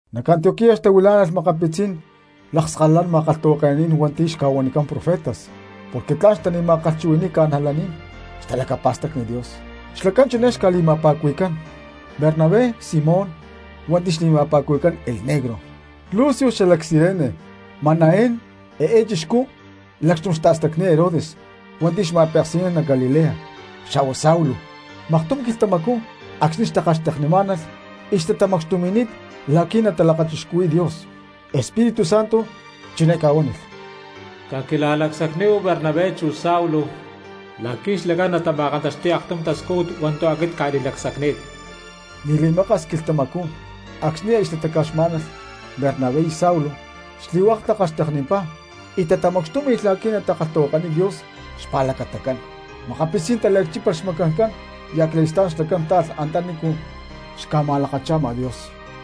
Nac Antioquía xtahuilá̠nalh makapitzí̠n lakskalalán ma̠kalhtahuake̠naní̠n hua̠nti̠ xca̠huanicán profetas porque tla̠n xtali̠ma̠kalhchuhui̠ni̠y cristianos xtalacapa̠stacni Dios, xlacán chiné xca̠li̠ma̠pa̠cuhui̠cán: Bernabé, Simón hua̠nti̠ xli̠ma̠pa̠cuhui̠cán El Negro, Lucio xalac Cirene, Manaén (eé chixcú lacxtum xta̠stacni̠t Herodes hua̠nti̠ xma̠peksi̠nán nac Galilea), xa̠hua Saulo. Maktum quilhtamacú acxni̠ xtakalhxteknimá̠nalh y xtatamacxtumi̠ni̠t la̠qui̠ natalakachixcuhui̠y Dios, Espíritu Santo chiné ca̠huánilh: —Caquila̠lacsacníhu Bernabé chu Saulo la̠qui̠ xlacán natama̠kantaxti̠y aktum tascújut hua̠ntu̠ aquit cca̠li̠lacsacni̠t. Ni̠ li̠maka̠s quilhtamacú acxni̠ aya xtataca̠xmá̠nalh Bernabé y Saulo, xli̠hua̠k takalhxteknimpá y tatamacxtúmi̠lh la̠qui̠ natakalhtahuakaniy Dios xpa̠lacatacán. Makapitzí̠n taliacchípalh xmacancán y acali̠stá̠n xlacán táalh antanícu xca̠ma̠lakacha̠ma Dios.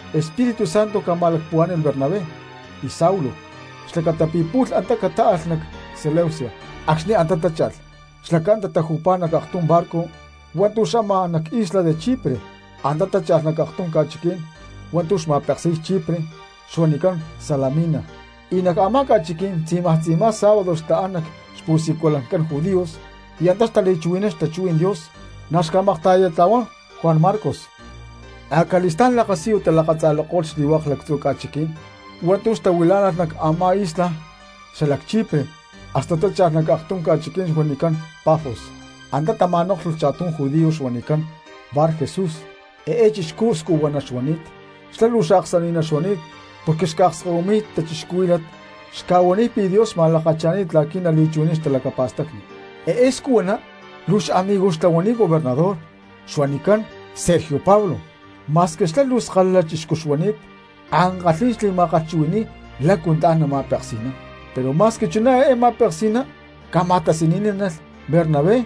Espíritu Santo ca̠ma̠lacpuhuá̠ni̠lh Bernabé y Saulo xlacata pi̠ pu̠lh antá catáalh nac Seleucia, acxni̠ antá tácha̠lh xlacán tataju̠pá nac aktum barco hua̠ntu̠ xamaj an nac isla de Chipre. Antá tácha̠lh nac aktum ca̠chiquí̠n hua̠ntu̠ xma̠peksi̠y Chipre xuanicán Salamina y nac a̠má ca̠chiquí̠n tzi̠maj tzi̠ma sábado xtaán nac xpu̠siculancán judíos y antá xtali̠chuhui̠nán xtachuhuí̠n Dios; na̠ xca̠makta̠yatla̠huán Juan Marcos. Acali̠stá̠n lakasiyu talakatza̠lako̠lh xli̠hua̠k lactzu̠ ca̠chiqui̠ní̠n hua̠ntu̠ xtahuilá̠nalh nac a̠má isla xla Chipre hasta tácha̠lh nac aktum ca̠chiquí̠n huanicán Pafos. Antá tama̠nóklhulh cha̠tum judío xuanicán Barjesús eé chixcú scuhuaná xuani̠t; xlá luu xaaksani̠ná xuani̠t porque xca̠akskahuiy cristianos xca̠huaniy pi̠ Dios xma̠lakacha̠ni̠t la̠qui̠ nali̠chuhui̠nán xtalacapa̠stacni. Eé scuhuaná luu xamigoj xtlahuani̠t gobernador xuanicán Sergio Pablo, ma̠squi xlá luu skalala chixcú xuani̠t ankalhí̠n xli̠ma̠kalhchuhui̠ni̠y lácu tla̠n nama̠peksi̠nán. Pero ma̠squi chuná eé ma̠peksi̠ná ca̠ma̠tasaní̠nalh Bernabé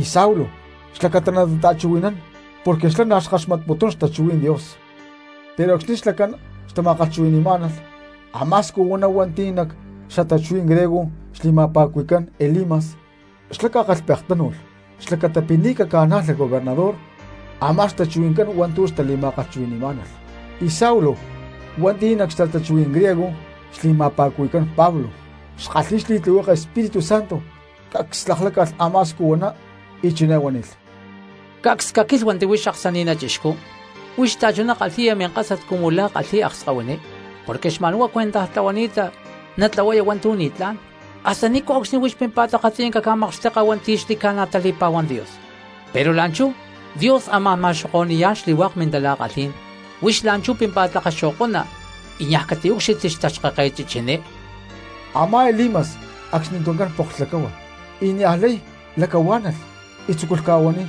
y Saulo xlacata natata̠chuhui̠nán porque xlá na̠ xkaxmatputún xtachuhuí̠n Dios. Pero acxni̠ xlacán xtama̠kalhchuhui̠ni̠má̠nalh, a̠má scuhuaná hua̠nti̠ nac xtachuhuí̠n griego xli̠ma̠pa̠cuhui̠cán Elimas, xlá ca̠kalhpektánu̠lh xlacata pi̠ ni̠ naca̠najlay gobernador a̠má xtachuhui̠ncán hua̠ntu̠ xtali̠ma̠kalhchuhui̠ni̠má̠nalh. Y Saulo, hua̠nti̠ nac xtachuhuí̠n griego xli̠ma̠pa̠cuhui̠cán Pablo, xkalhi̠y xli̠tlihueke Espíritu Santo, cacs lakláca̠lh a̠má scuhuaná, y chiné huánilh: —¡Cacs caquílhuanti huix aksani̠ná chixcú, huix xta̠chuná kalhi̠ya minkásat cumu la̠ kalhi̠y akskahuiní porque xma̠nhuá cuentaj tlahuani̠ta natlahuaya hua̠ntu̠ ni̠tlá̠n! ¿Hasta ni̠nco̠cxni huix pímpa̠t akatziyanca ca̠makxteka hua̠nti̠ xli̠ca̠na tali̠pa̠huamputún Dios? Pero la̠nchú Dios amá̠n ma̠xoko̠ni̠yá̠n xli̠hua̠k mintala̠kalhí̠n, huix la̠nchú pímpa̠t lakaxo̠ko̠na y niaj catiúcxilhti xtaxkáket chichiní. Amá Elimas acxnituncán poklh lacáhua y niajlay lacahuá̠nalh y tzúculh ca̠huaniy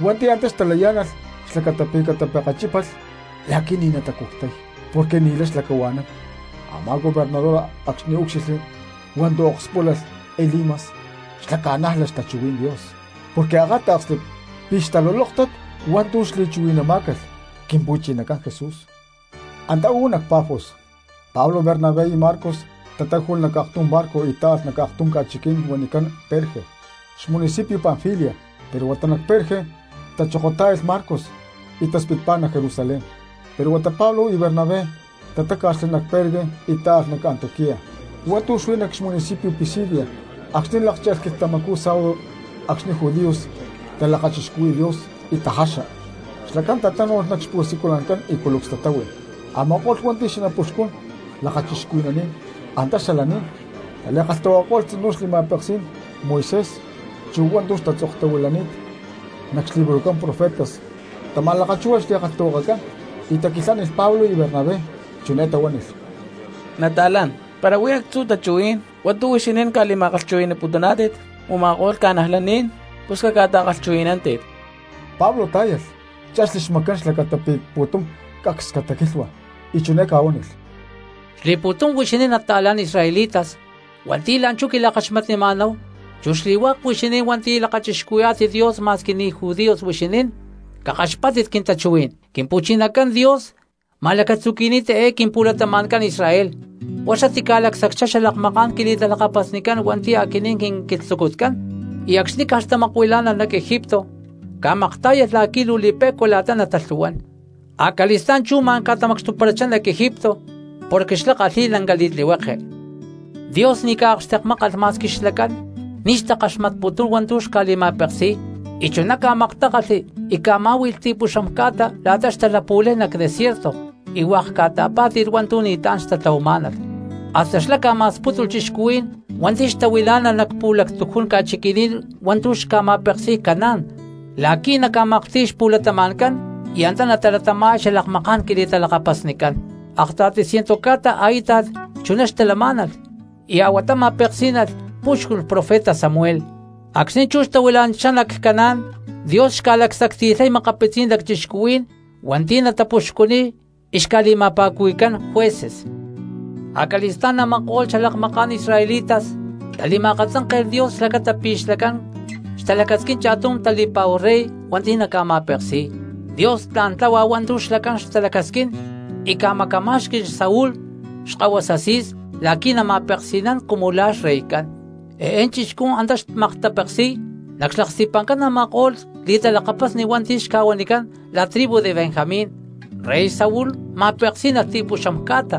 hua̠nti̠ antá xtalayá̠nalh xlacata pi̠ catapekechipále̠lh la̠qui̠ ni̠ natacuctay porque ni̠lay xlacahua̠nán. Amá gobernador acxni̠ úcxilhli hua̠ntu̠ okspúlalh Elimas xlá ca̠nájlalh xtachuhuí̠n Dios porque akáta̠ksli pi̠ xtalulóktat hua̠ntu̠ xli̠chuhui̠namá̠calh Quimpu̠chinacán Jesús. Antá uú nac Pafos, Pablo, Bernabé y Marcos tatáju̠lh nac aktum barco y táalh nac aktum ca̠chiquí̠n huanicán Perge cxmunicipio Panfilia. Pero huata nac Perge tachokotá̠yalh Marcos y taspitpá nac Jerusalén. Pero huata Pablo y Bernabé tatáca̠xli nac Perge y táalh nac Antioquía hua̠ntu̠ huí nac xmunicipio Pisidia. Acxni̠ lákcha̠lh quilhtamacú sábado acxni̠ judíos talakachixcuhui̠y Dios y tajaxa, xlacán tatánu̠lh nac xpu̠siculancán y culucs tatáhui. Ama̠ko̠lh hua̠nti̠ xanapuxcun lakachixcuhui̠naní̠n antá xalaní̠n tali̠kalhtahuakako̠lh tzinú xli̠ma̠peksí̠n Moisés chu hua̠ntu̠ tatzoktahuilani̠t nac xlibrojcán profetas, tama̠lakchúhualh xli̠kalhtahuakacán y taquilhánilh Pablo y Bernabé, chiné tahuánilh: —Nata̠lán, para huí actzu̠ tachuhuí̠n hua̠ntu̠ huixinín ca̠li̠ma̠kalhchuhui̠ni̠putuná̠tit u̠ma̠ko̠lh cristianos pus caca̠ta̠kalhchuhui̠nántit. Pablo tá̠yalh, chexli xmacán xlacata pi̠ pu̠tum cacs cataquilhua, y chiné ca̠huánilh: —Xli̠pu̠tum huixinín nata̠lán israelitas hua̠nti̠ la̠nchú quila̠kaxmatnima̠náhu, chu xli̠hua̠k huixinín hua̠nti̠ lakachixcuhuí̠yá̠tit Dios ma̠squi ni̠ judíos huixinín, cakaxpátit quintachuhuí̠n: Quimpu̠chinacán Dios ma̠lacatzuqui̠ni̠t eé quimpu̠latama̠ncán Israel, huá xlá tica̠lacsacchá xalakmaká̠n quili̠talakapasnicán hua̠nti̠ aquinín quinquilhtzucutcán, y acxni̠ caj xtamakuilá̠nalh nac Egipto ca̠maktá̠yalh la̠qui̠ luu li̠pe̠cua la̠ta natalhu̠huán, acali̠stá̠n chú ma̠n ca̠tamacxtuparachá nac Egipto porque xlá kalhi̠y lanca li̠tlihueke. Dios ni̠ ca̠akxtekmákalh ma̠squi xlacán ni̠ xtakalhakaxmatputún hua̠ntu̠ xca̠li̠ma̠peksi̠y y chuná ca̠maktákalhli y ca̠má̠hui̠lh ti̠puxam ca̠ta la̠ta xtalapu̠lay nac desierto y hua̠k ca̠ta̠pá̠ti̠lh hua̠ntu̠ ni̠tlá̠n xtatlahuamá̠nalh. Hasta xlá ca̠ma̠spútulh cristianos hua̠nti̠ xtahuilá̠nalh nac pu̠lactujún ca̠chiqui̠ní̠n hua̠ntu̠ xca̠ma̠peksi̠y Canaán la̠qui̠ naca̠maklhti̠y xpu̠latama̠ncán y antá natalatama̠y xalakmaká̠n quili̠talakapasnicán. ’Akta̠ti ciento ca̠ta a̠íta̠t chuná xtalamá̠nalh y a̠huatá ma̠peksí̠nalh púxculh profeta Samuel. Acxni̠ chú xtahuilá̠nalh nac Canaán Dios xca̠lacsacti̠lhay makapitzí̠n lacchixcuhuí̠n hua̠nti̠ naca̠puxcuniy y xca̠li̠ma̠pa̠cuhui̠cán jueces. ’Acali̠stá̠n a̠ma̠ko̠lh xalakmaká̠n israelitas tali̠ma̠akatzánke̠lh Dios xlacata pi̠ xlacán xtalacasquín cha̠tum tali̠pa̠hu rey hua̠nti̠ naca̠ma̠peksi̠y. Dios tla̠n tláhua hua̠ntu̠ xlacán xtalacasquín y ca̠macamá̠xqui̠lh Saúl xkahuasa Cis la̠qui̠ nama̠peksi̠nán cumu la̠ xreycán; eé chixcú antá xmaktapeksi̠y nac xlaksti̠pa̠ncán a̠ma̠ko̠lh li̠talakapasni hua̠nti̠ xca̠huanicán la tribu de Benjamín. Rey Saúl ma̠peksí̠nalh ti̠puxam ca̠ta.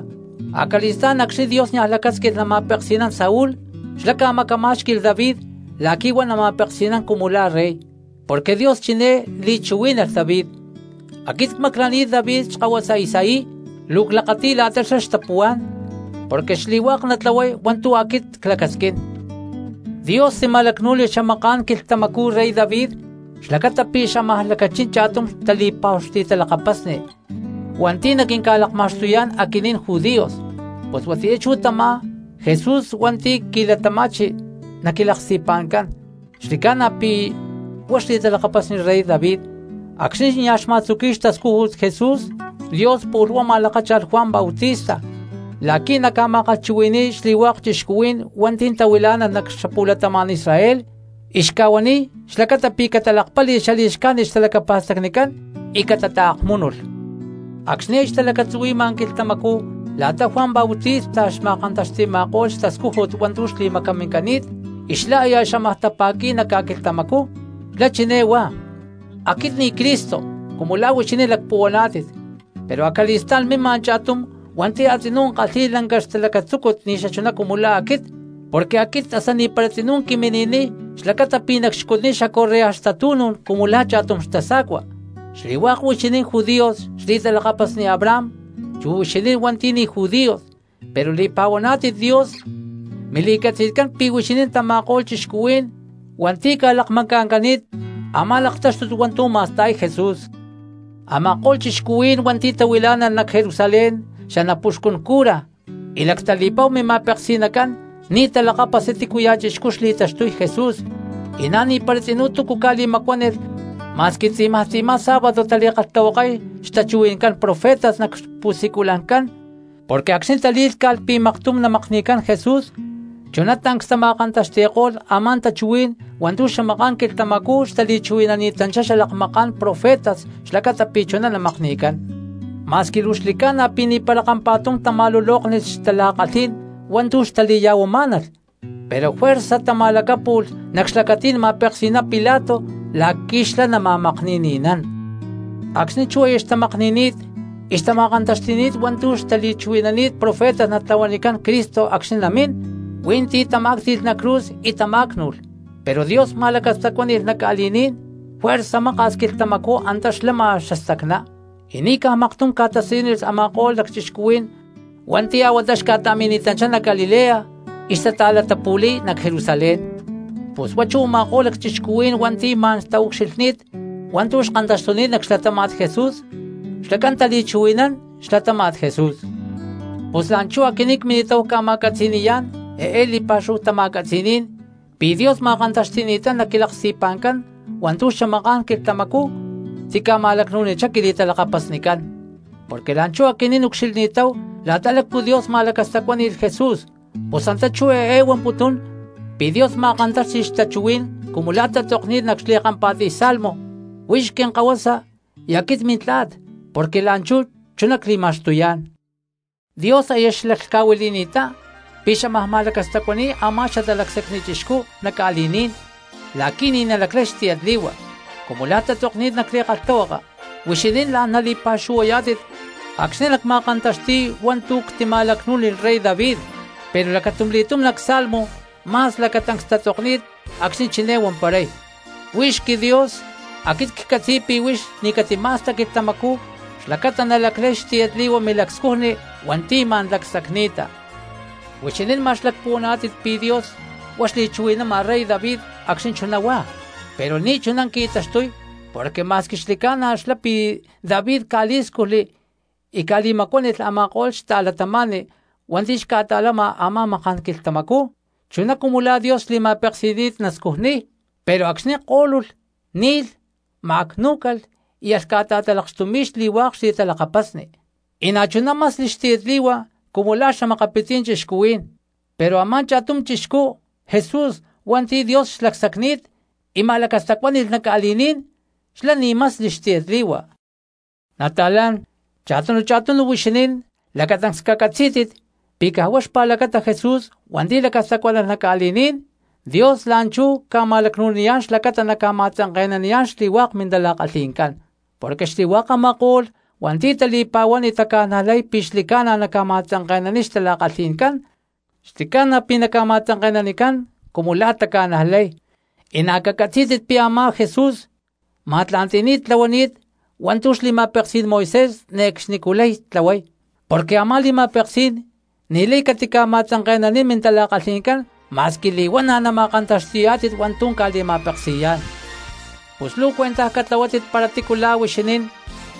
Acali̠stá̠n acxni̠ Dios niaj lacásquilh nama̠peksi̠nán Saúl xlá ca̠macamá̠xqui̠lh David la̠qui̠ huá nama̠peksi̠nán cumu la̠ rey, porque Dios chiné li̠chuhuí̠nalh David: “Aquit cmaclani̠t David xkahuasa Isaí, luu clakati̠y la̠ta xlá tla̠n xtapuhuá̠n porque xli̠hua̠k natlahuay hua̠ntu̠ aquit clacasquín.” Dios tima̠lacnú̠nilh xamaká̠n quilhtamacú rey David xlacata pi̠ xámaj lacachín cha̠tum tali̠pa̠hu xli̠talakapasni hua̠nti̠ naquinca̠lakma̠xtuyá̠n aquinín judíos, pus huatiyá chú tamá Jesús hua̠nti̠ qui̠latama̠chi nac quilaksti̠pa̠ncán xli̠ca̠na pi̠ huá xli̠talakapasni rey David. Acxni̠ nia̠ xma̠tzuqui̠y xtascújut Jesús, Dios pu̠lh huá ma̠lakácha̠lh Juan Bautista la̠qui̠ naca̠ma̠kalhchuhui̠ni̠y xli̠hua̠k cristianos hua̠nti̠ tahuilá̠nalh nac xapu̠latama̠n Israel y xca̠huaniy xlacata pi̠ catalakpáli̠lh xali̠xcájnit xtalacapa̠stacnicán y catataakmúnulh. Acxni̠ aya xtalacatzuhui̠ma quilhtamacú la̠ta Juan Bautista xma̠kantaxti̠ma̠ko̠lh xtascújut hua̠ntu̠ xli̠macamincani̠t y xlá aya xámaj tapa̠qui̠y nac ca̠quilhtamacú, xlá chiné huá: “Aquit ni̠ Cristo cumu la̠ huixinín lacpuhuaná̠tit, pero acali̠stá̠n mima cha̠tum hua̠nti̠ a̠tzinú kalhi̠y lanca xlacatzúcut ni̠ xachuná cumu la̠ aquit, porque aquit hasta ni̠para tzinú quimi̠ni̠niy xlacata pi̠ nacxcutniy xacorrea xtatu̠nú̠n cumu la̠ cha̠tum xtasa̠cua.” ’Xli̠hua̠k huixinín judíos xli̠talakapasni Abraham chu huixinín hua̠nti̠ ni̠ judíos pero li̠pa̠huaná̠tit Dios, mili̠catzi̠tcán pi̠ huixinín tama̠ko̠lh cristianos hua̠nti̠ ca̠lakmacatancani̠tátit a̠má laktáxtut hua̠ntu̠ ma̠sta̠y Jesús. Ama̠ko̠lh cristianos hua̠nti̠ xtahuilá̠nalh nac Jerusalén xanapuxcun cura y lactali̠pa̠hu mima̠peksi̠nacán ni̠ talakápasli tícuya̠ chixcú xli̠taxtuy Jesús, y na̠ ni̠para tzinú túcu ca̠li̠macuánilh ma̠squi tzi̠maj tzi̠má sábado tali̠kalhtahuakay xtachuhui̠ncán profetas nac xpu̠siculancán, porque acxni̠ talí̠lhca̠lh pi̠ maktum namakni̠cán Jesús, chuná tancs tama̠kantaxti̠ko̠lh a̠má tachuhuí̠n hua̠ntu̠ xamaká̠n quilhtamacú xtali̠chuhui̠nani̠tanchitá xalakmaká̠n profetas xlacata pi̠ chuná namakni̠cán. Ma̠squi luu xli̠ca̠na pi̠ ni̠para kampa̠tum tama̠lulóknilh xtala̠kalhí̠n hua̠ntu̠ xtali̠ya̠huamá̠nalh, pero juerza tama̠lacápu̠lh nac xlacatí̠n ma̠peksi̠ná Pilato la̠qui̠ xlá nama̠makni̠ni̠nán. Acxni̠ chú aya xtamakni̠ni̠t y xtama̠kantaxti̠ni̠t hua̠ntu̠ xtali̠chuhui̠naní̠t profetas natlahuanicán Cristo acxni̠ namín, hui̠ntí tamá̠cti̠lh nac cruz y tamá̠cnu̠lh. Pero Dios ma̠lacastacuáni̠lh nacca̠li̠ní̠n y juerza maka̠s quilhtamacú antá xlama xastacná, y ni̠caj maktum ca̠tasiyúnilh a̠ma̠ko̠lh lacchixcuhuí̠n hua̠nti̠ a̠huatá xca̠ta̠mini̠tanchá nac Galilea y xtata̠latapu̠li̠y nac Jerusalén. Pus huá chú u̠ma̠ko̠lh lacchixcuhuí̠n hua̠nti̠ ma̠n taucxilhní̠t hua̠ntu̠ kantaxtuni̠t nac xlatáma̠t Jesús xlacán tali̠chuhui̠nán xlatáma̠t Jesús. ’Pus la̠nchú aquinín cmini̠táhu ca̠ma̠catzi̠ni̠yá̠n eé li̠pa̠xúhu tama̠catzi̠ní̠n pi̠ Dios ma̠kantaxti̠ni̠ttá nac quilaksti̠pa̠ncán hua̠ntu̠ xamaká̠n quilhtamacú tica̠ma̠lacnu̠nichá quili̠talakapasnicán. Porque la̠nchú aquinín ucxilhni̠táhu la̠ta lácu Dios ma̠lacastacuáni̠lh Jesús, pus antá chú eé huamputún pi̠ Dios ma̠kantáxti̠lh xtachuhuí̠n cumu la̠ tatzokni̠t nac xli̠kampa̠tiy salmo: “Huix quinkahuasa y aquit mintla̠t porque la̠nchú chuná cli̠ma̠xtuyá̠n.” Dios aya xlaclhca̠huili̠ni̠ttá pi̠ xámaj ma̠lacastacuani̠y a̠má xatalacsacni chixcú nac ca̠li̠ní̠n la̠qui̠ ni̠ nalaclay xli̠hua, cumu la̠ tatzokni̠t nac li̠kalhtahuaka: “Huixinín la̠n nali̠pa̠xuhuayá̠tit acxni̠ nacma̠kantaxti̠y hua̠ntu̠ ctima̠lacnú̠nilh rey David.” Pero lacatumli̠túm nac salmo ma̠s lacatancs tatzokni̠t acxni̠ chiné huamparay: “Huix quiDios, aquit ccatzi̠y pi̠ huix ni̠ catima̠sta quilhtamacú xlacata nalaclay xtiyatli̠hua milacscujni hua̠nti̠ ma̠n lacsacni̠ta.” Huixinín ma̠x lacpuhuaná̠tit pi̠ Dios huá xli̠chuhui̠nama rey David acxni̠ chuná huá, pero ni̠ chuná qui̠taxtuy porque ma̠squi xli̠ca̠na xlá pi̠ David ca̠lí̠scujli y ca̠li̠macuánilh a̠ma̠ko̠lh xta̠cristianos hua̠nti̠ xca̠ta̠lama a̠má maká̠n quilhtamacú chuná cumu la̠ Dios xli̠ma̠peksi̠ni̠t nascujniy, pero acxni̠ kó̠lulh, ni̠lh, ma̠cnú̠calh y alh ca̠ta̠talakxtumi̠y xli̠hua̠k xli̠talakapasni, y na̠chuná masli xtiyatli̠hua cumu la̠ xa̠makapitzí̠n cristianos. Pero a̠má cha̠tum chixcú Jesús hua̠nti̠ Dios xlacsacni̠t y ma̠lacastacuáni̠lh nac ca̠li̠ní̠n xlá ni̠ masli xtiyatli̠hua. Nata̠lán, cha̠tunu cha̠tunu huixinín lacatancs cacatzí̠tit pi̠ caj huá xpa̠lacata Jesús hua̠nti̠ lacastacuánalh nac ca̠li̠ní̠n Dios la̠nchú ca̠ma̠lacnu̠niyá̠n xlacata naca̠ma̠tzanke̠naniyá̠n xli̠hua̠k mintala̠kalhi̠ncán. Porque xli̠hua̠k a̠ma̠ko̠lh hua̠nti̠ tali̠pa̠huán y taca̠najlay pi̠ xli̠ca̠na naca̠ma̠tzanke̠naniy xtala̠kalhi̠ncán xli̠ca̠na pi̠ ca̠ma̠tzanke̠nanicán cumu la̠ taca̠najlay, y na̠ cacatzí̠tit pi̠ a̠má Jesús ma̠tla̠nti̠ni̠t tlahuani̠t hua̠ntu̠ xli̠ma̠peksí̠n Moisés ne̠cxnicú lay tlahuay, porque a̠má li̠ma̠peksí̠n ni̠lay catama̠tzanke̠nanín mintala̠kalhi̠ncán ma̠squi li̠huana̠ nama̠kantaxtiyá̠tit hua̠ntu̠ ca̠li̠ma̠peksi̠yá̠n. Pus luu cuentaj catlahuátit para tícu la̠ huixinín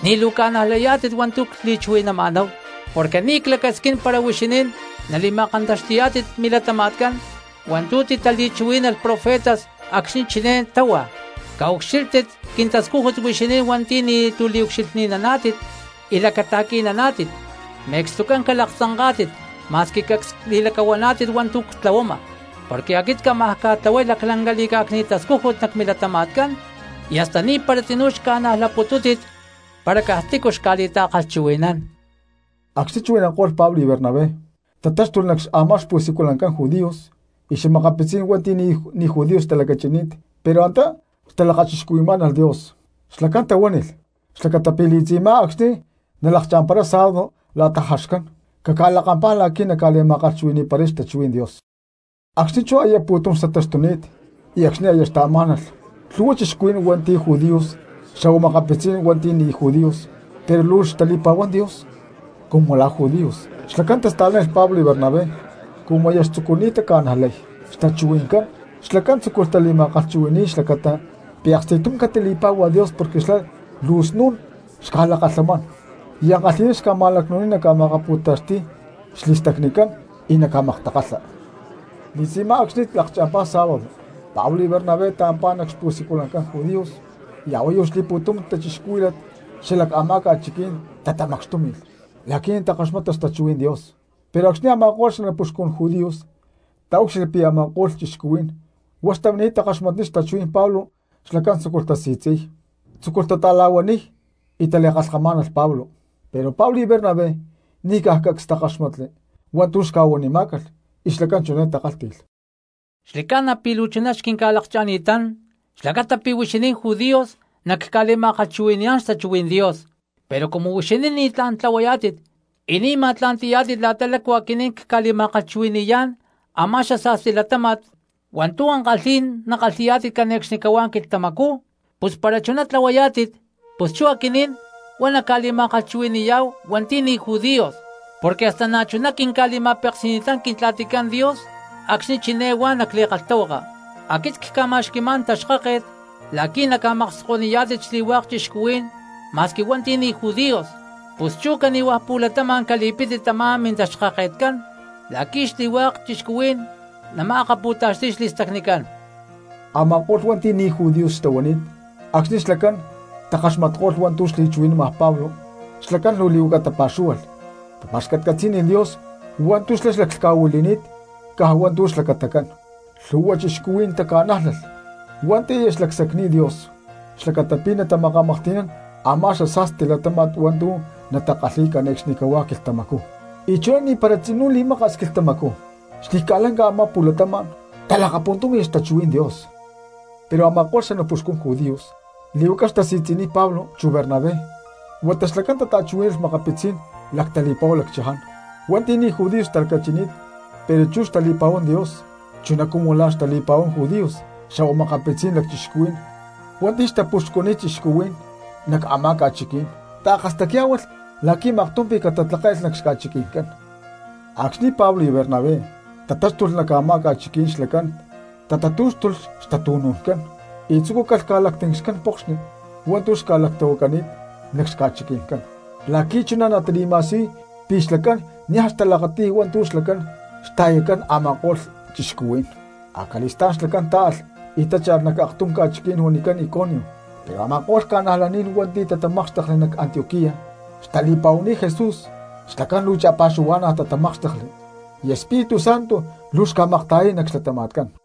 ni̠ luu ca̠najlayá̠tit hua̠ntu̠ cli̠chuhui̠nama̠náhu, porque ni̠ clacasquín para huixinín nali̠ma̠kantaxti̠yá̠tit milatama̠tcán hua̠ntu̠ titali̠chuhuí̠nalh profetas acxni̠ chiné táhua: Caucxílhtit quintascújut huixinín hua̠nti̠ ni̠tu̠ liucxilhninaná̠tit y lacata̠qui̠naná̠tit, me̠cstucán calaktzanká̠tit ma̠squi cacs li̠lacahuaná̠tit hua̠ntu̠ ctlahuama. Porque aquit cámaj ca̠tlahuay laclanca li̠cá̠cni̠t tascújut nac milatama̠tcán, y hasta ni̠para tzinú xca̠najlaputútit para caj tícu xca̠li̠ta̠kalhchuhui̠nán. Acxni̠ chuhui̠nanko̠lh Pablo y Bernabé tatáxtulh nac a̠má xpu̠siculancán judíos, y makapitzí̠n hua̠nti̠ ni̠ judíos xtalacachinít pero antá xtata̠lakachixcuhui̠má̠nalh Dios, xlacán tahuánilh xlacata pi̠ li̠tzi̠má acxni̠ nalakcha̠mparay sábado la̠ta jaxcán caca̠lakampá la̠qui̠ naca̠li̠ma̠kalhchuhui̠ni̠paray xtachuhuí̠n Dios. Acxni̠ chú aya pu̠tum xtataxtuni̠t y acxni̠ aya xtaamá̠nalh, lhu̠hua cristianos hua̠nti̠ judíos xa̠hua makapitzí̠n hua̠nti̠ ni̠ judíos pero luu xtali̠pa̠huán Dios cumu la̠ judíos, xlacán tasta̠lánilh Pablo y Bernabé. Cumu aya xtzucuni̠t taca̠najlay xtachuhui̠ncán xlacán tzúculh tali̠ma̠kalhchuhui̠ni̠y xlacata pi̠ aksti̠tum catali̠pá̠hualh Dios porque xlá luu snu̠n xca̠lakalhamán y ankalhi̠ná ca̠ma̠lacnu̠niy naca̠ma̠kapú̠taxti̠y xli̠stacnicán y naca̠maktakalha. Li̠tzi̠má acxni̠ lakcha̠mpá sábado Pablo y Bernabé taampá nac xpu̠siculancán judíos y a̠huayu xli̠pu̠tum cristianos xala a̠má ca̠chiquí̠n tatamacxtúmi̠lh la̠qui̠ natakaxmata xtachuhuí̠n Dios. Pero acxni̠ a̠ma̠ko̠lh xanapuxcún judíos taúcxilhli pi̠ a̠ma̠ko̠lh cristianos huá xtamini̠t takaxmatniy xtachuhuí̠n Pablo xlacán tzúculh tasi̠tzi̠niy, tzúculh tata̠la̠huaniy y tali̠kalhkamá̠nalh Pablo. Pero Pablo y Bernabé ni̠caj cacs takáxmatli hua̠ntu̠ xca̠huanimá̠calh, y xlacán chiné takálhti̠lh: —Xli̠ca̠na pi̠ luu chuná xquinca̠lakcha̠ni̠tán xlacata pi̠ huixinín judíos nacca̠liakchuhui̠naniyá̠n xtachuhuí̠n Dios, pero cumu huixinín ni̠tlá̠n tlahuayá̠tit y ni̠ ma̠tla̠nti̠yá̠tit la̠ta lácu aquinín cca̠li̠ma̠kalhchuhui̠ni̠yá̠n a̠má xasa̠sti latáma̠t hua̠ntu̠ ankalhí̠n nakalhi̠yá̠tit cane̠cxnicahuá quilhtamacú, pus para chuná tlahuayá̠tit pus chú aquinín huá nacca̠li̠ma̠kalhchuhui̠ni̠yá̠hu hua̠nti̠ ni̠ judíos. porque hasta na̠chuná quinca̠li̠ma̠peksi̠ni̠tán Quintla̠ticán Dios acxni̠ chiné huá nac li̠kalhtahuaka: Aquit cca̠ma̠xqui̠má̠n taxkáket la̠qui̠ naca̠makskoniyá̠tit xli̠hua̠k cristianos ma̠squi hua̠nti̠ ni̠ judíos. Pus chú cani̠hua̠ pu̠latama̠n cali̠pítit tamá mintaxkaketcán la̠qui̠ xli̠hua̠k cristianos nama̠akapu̠taxti̠y xli̠stacnicán. Ama̠ko̠lh hua̠nti̠ ni̠ judíos xtahuani̠t acxni̠ xlacán takaxmatko̠lh hua̠ntu̠ xli̠chuhui̠nama Pablo xlacán luu lí̠huaca tapa̠xúhualh, tapa̠xcatcatzí̠nilh Dios hua̠ntu̠ xlá xlaclhca̠huili̠ni̠t caj hua̠ntu̠ xlacatacán. Lhu̠hua cristianos taca̠nájlalh hua̠nti̠ aya xca̠lacsacni̠t Dios xlacata pi̠ natamakamaklhti̠nán a̠má xasa̠sti latáma̠t hua̠ntu̠ natakalhíy cane̠cxnicahuá quilhtamacú. Y chuná ni̠para tzinú xli̠maka̠s quilhtamacú xli̠ca̠lanca a̠má pu̠latama̠n talakapuntúmi̠lh xtachuhuí̠n Dios. Pero a̠ma̠ko̠lh xanapuxcun judíos lí̠huaca xtasi̠tzi̠niy Pablo chu Bernabé, huata xlacán tata̠chuhuí̠nalh makapitzí̠n lactali̠pa̠hu lacchaján hua̠nti̠ ni̠ judíos xtalacachini̠t pero chú xtali̠pa̠huán Dios chuná cumu la̠ xtali̠pa̠huán judíos, xa̠hua makapitzí̠n lacchixcuhuí̠n hua̠nti̠ xtapuxcuniy cristianos nac a̠má ca̠chiquí̠n, taakastacyá̠hualh la̠qui̠ maktum pi̠ catatlakále̠lh nac xca̠chiqui̠ncán. Acxni̠ Pablo y Bernabé tatáxtulh nac a̠má ca̠chiquí̠n xlacán tatatú̠xtulh xtatu̠nu̠ncán y tzucúcalh ca̠lactincxcán pokxni hua̠ntu̠ xca̠lactahuacani̠t nac xca̠chiqui̠ncán la̠qui̠ chuná natali̠ma̠siyuy pi̠ xlacán niaj xtalakati̠y hua̠ntu̠ xlacán xta̠yatcán a̠ma̠ko̠lh cristianos. Acali̠stá̠n xlacán táalh y tácha̠lh nac aktum ca̠chiquí̠n huanicán Iconio. Pero a̠ma̠ko̠lh cristianos hua̠nti̠ tatamákxtekli nac Antioquía xtali̠pa̠huani̠t Jesús xlacán luu cha̠pa̠xuhua̠na̠ tatamákxtekli, y Espíritu Santo luu xca̠makta̠yay nac xlatama̠tcán.